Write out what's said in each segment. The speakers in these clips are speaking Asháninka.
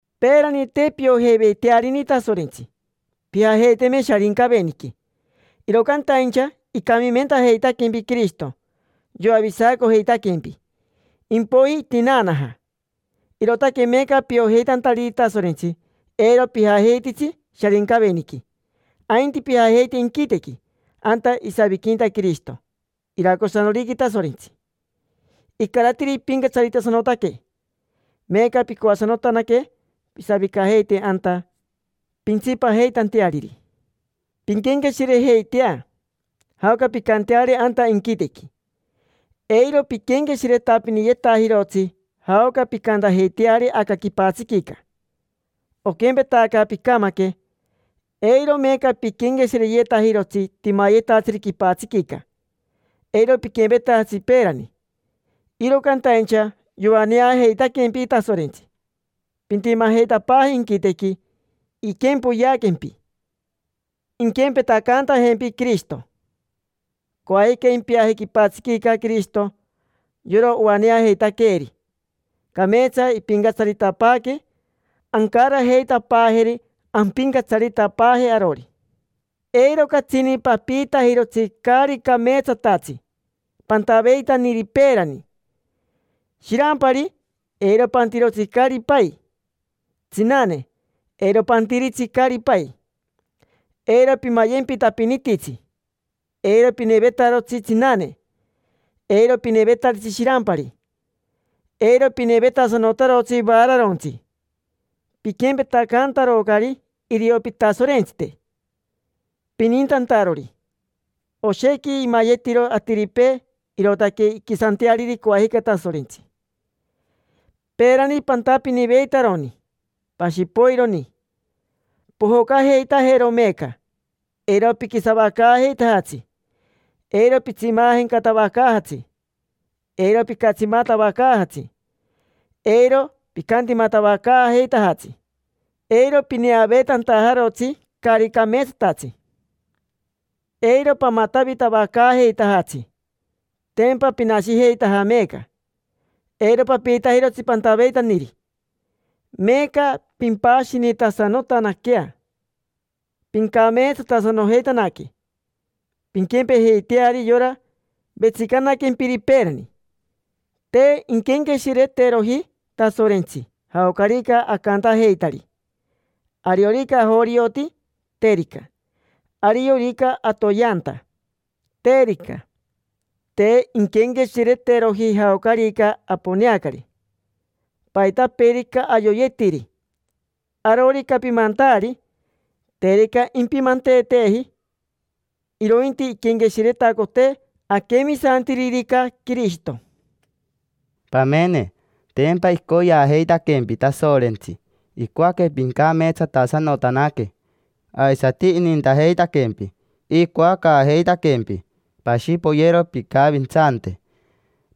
Peerani te piojeiveitearini Tasorentsi, pijajeiteme Sharincaveniqui; iro cantaincha icamimentajeitaquempi Quirishito, yoavisacojeitaquempi. Impoiji itinaanaja; irootaque meeca piojeitantariri Tasorentsi, eiro pijajeititsi Sharincaveniqui, ainti pijajeite inquitequi: anta isaviquinta Quirishito iracosanoriqui Tasorentsi, icaratiri ipincatsaritasanotaque. Meeca pincoasanotanaque pisavicajeite anta, pintsipajeitanteariri. Pinquenqueshirejeitea jaoca pincanteari anta inquitequi, eiro piquenqueshiretapiniyetajirotsi jaoca pincantajeiteari aca quipatsiquica. Oquempetaca picamaque, eiro meeca piquenqueshireyetajirotsi timayetatsiri quipatsiquica, eiro piquempetajatsi peerani. Iro cantaincha yoaneajeitaquempi Tasorentsi, pintimajeitapaaje inquitequi. Iquempoyeaquempi, inquempetacantajempi Quirishito. Coajica impiaje quipatsiquica Quirishito, yora oaneajeitaqueeri. Cameetsa impincatsaritapaaque, ancarajeitapaajeri ampincatsaritapaaje arori. Eiro catsini papiitajirotsi caari cameetsatatsi pantaveitaniri peerani. Shirampari, eiro pantirotsi caari pai. Tsinane, eiro pantiritsi caari pai. Eiro pimayempitantapinititsi. Eiro pinevetarotsi tsinane. Eiro pinevetaritsi shirampari. Eiro pinevetasanotarotsi vaararontsi: piquempetacantarocari irio pitasorentsite pinintantarori. Oshequi imayetiro atiripee, irootaque inquisanteariri coajica Tasorentsi. Peerani pantapiniveitaroni, pashi poironi. Pojocajeitajero meeca: eiro piquisavacaajeitajatsi, eiro pitsimajencatavacaajatsi, eiro picatsimatavacaajatsi, eiro picantimatavacaajeitajatsi, eiro pineaveetantajarotsi caari cameetsatatsi, eiro pamatavitavacaajeitajatsi. Tempa pinashijeitaja meeca, eiro papiitajirotsi pantaveitaniri. Meeca pimpashinitasanotanaquea, pincameetsatasanojeitanaque, pinquempejeiteari yora Vetsicanaquempiri peerani. Te inquenqueshireteroji Tasorentsi jaocarica acantajeitari: ariorica ajorioti, terica; ariorica atoyeanta, terica. Te inquenqueshireteroji jaocarica aponeacari, paitapeerica ayoyetiri, arorica pimantaari, terica impimanteeteeji. Irointi iquenqueshiretacotee aquemisantiririca Quirishito. Pamene, tempa icoyeajeitaquempi Tasorentsi. Icoaque pincameetsatasanotanaque, aisati inintajeitaquempi. Icoacaajeitaquempi pashi poyero pincavintsante,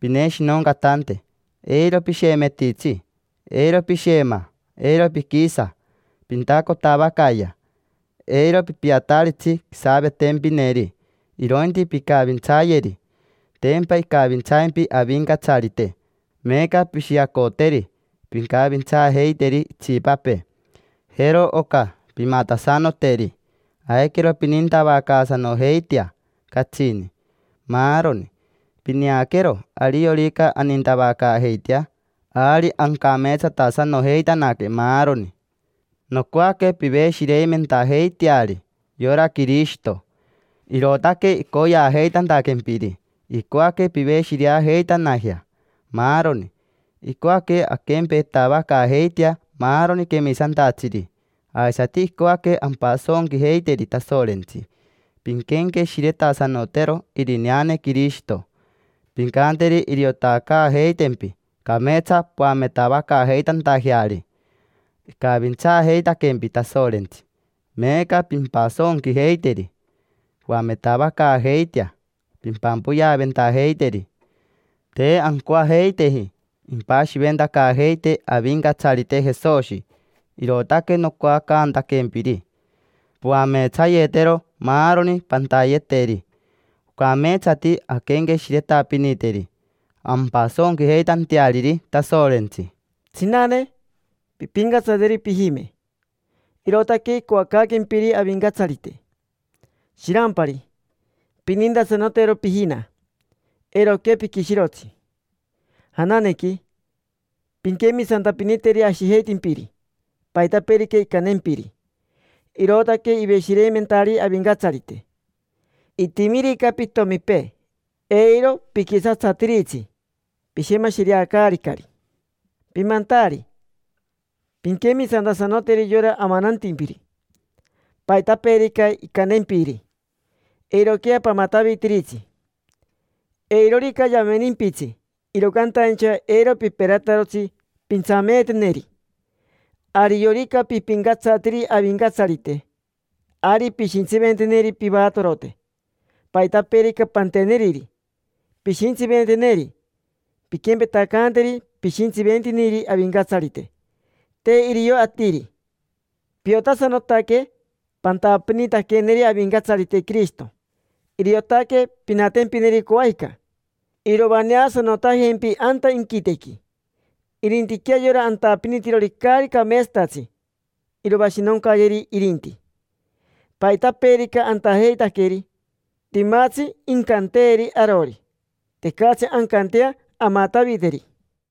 pineshinoncatante. Eiro pishemetitsi, eiro pishema, eiro piquisa. Pintacotavacaayea: eiro pipiataritsi quisavetempineri, irointi pincavintsayeri. Tempa icavintsaimpi Avincatsarite, meeca pishiacoteri, pincavintsaajeiteri itsipapee. Jero oca pimatasanoteri: aiquero pinintavacaasanojeitea catsini, maaroni. Pineaquero, ariorica anintavacaajeitea, ari ancameetsatasanojeitanaque maaroni. Nocoaque piveshireimentajeiteari yora Quirishito. Irootaque icoyeajeitantaquempiri, icoaque piveshireajeitanajea, maaroni. Icoaque anquempetavacaajeitea, maaroni quemisantatsiri. Aisati icoaque ampasonquijeiteri Tasorentsi. Pinquenqueshiretasanotero irineane Quirishito. Pincanteri iriotacaajeitempi cameetsa poametavacaajeitantajeari. Icavintsaajeitaquempi Tasorentsi, meeca pimpasonquijeiteri. Poametavacaajeitea pimpampoyeaventajeiteri. Te ancoajeiteji impashiventacaajeitee Avincatsarite Jesoshi, irootaque nocoacantaquempiri poameetsayetero maaroni pantayeteri. Ocameetsati anquenqueshiretapiniteri, ampasonquijeitanteariri Tasorentsi. Tsinane, pimpincatsateri pijime, irootaque icoacaaquempiri Avincatsarite. Shirampari, pinintasanotero pijina, eiroquea piquishirotsi. Jananequi, pinquemisantapiniteri ashijeitimpiri, paitapeerica incantempiri. Irootaque iveshireimentari Avincatsarite. Itimirica pitomipee, eiro piquisatsatiritsi: pishemashireacaaricari. Pimantaari, pinquemisantasanoteri yora amanantimpiri, paitapeerica incantempiri. Eiroquea pamatavitiritsi: eirorica yamenimpitsi, iro cantaincha eiro piperatarotsi pintsameeteneri. Ariorica pipincatsatiri Avincatsarite, ari pishintsiventeneri pivatorote. Paitapeerica panteneriri, pishintsiventeneri. Pinquempetacanteri pishintsiventiniri Avincatsarite, te irio atiri. Piotasanotaque pantapinitaqueneri Avincatsarite Quirishito, iriotaque pinatempineri coajica, iroaneasanotajempi anta inquitequi. Irintiquea yora antapinitirori caari cameetsatatsi: iroashinoncayeri irinti. Paitapeerica antajeitaqueri, timatsi incanteeri arori, tecatsi ancantea amataviteri.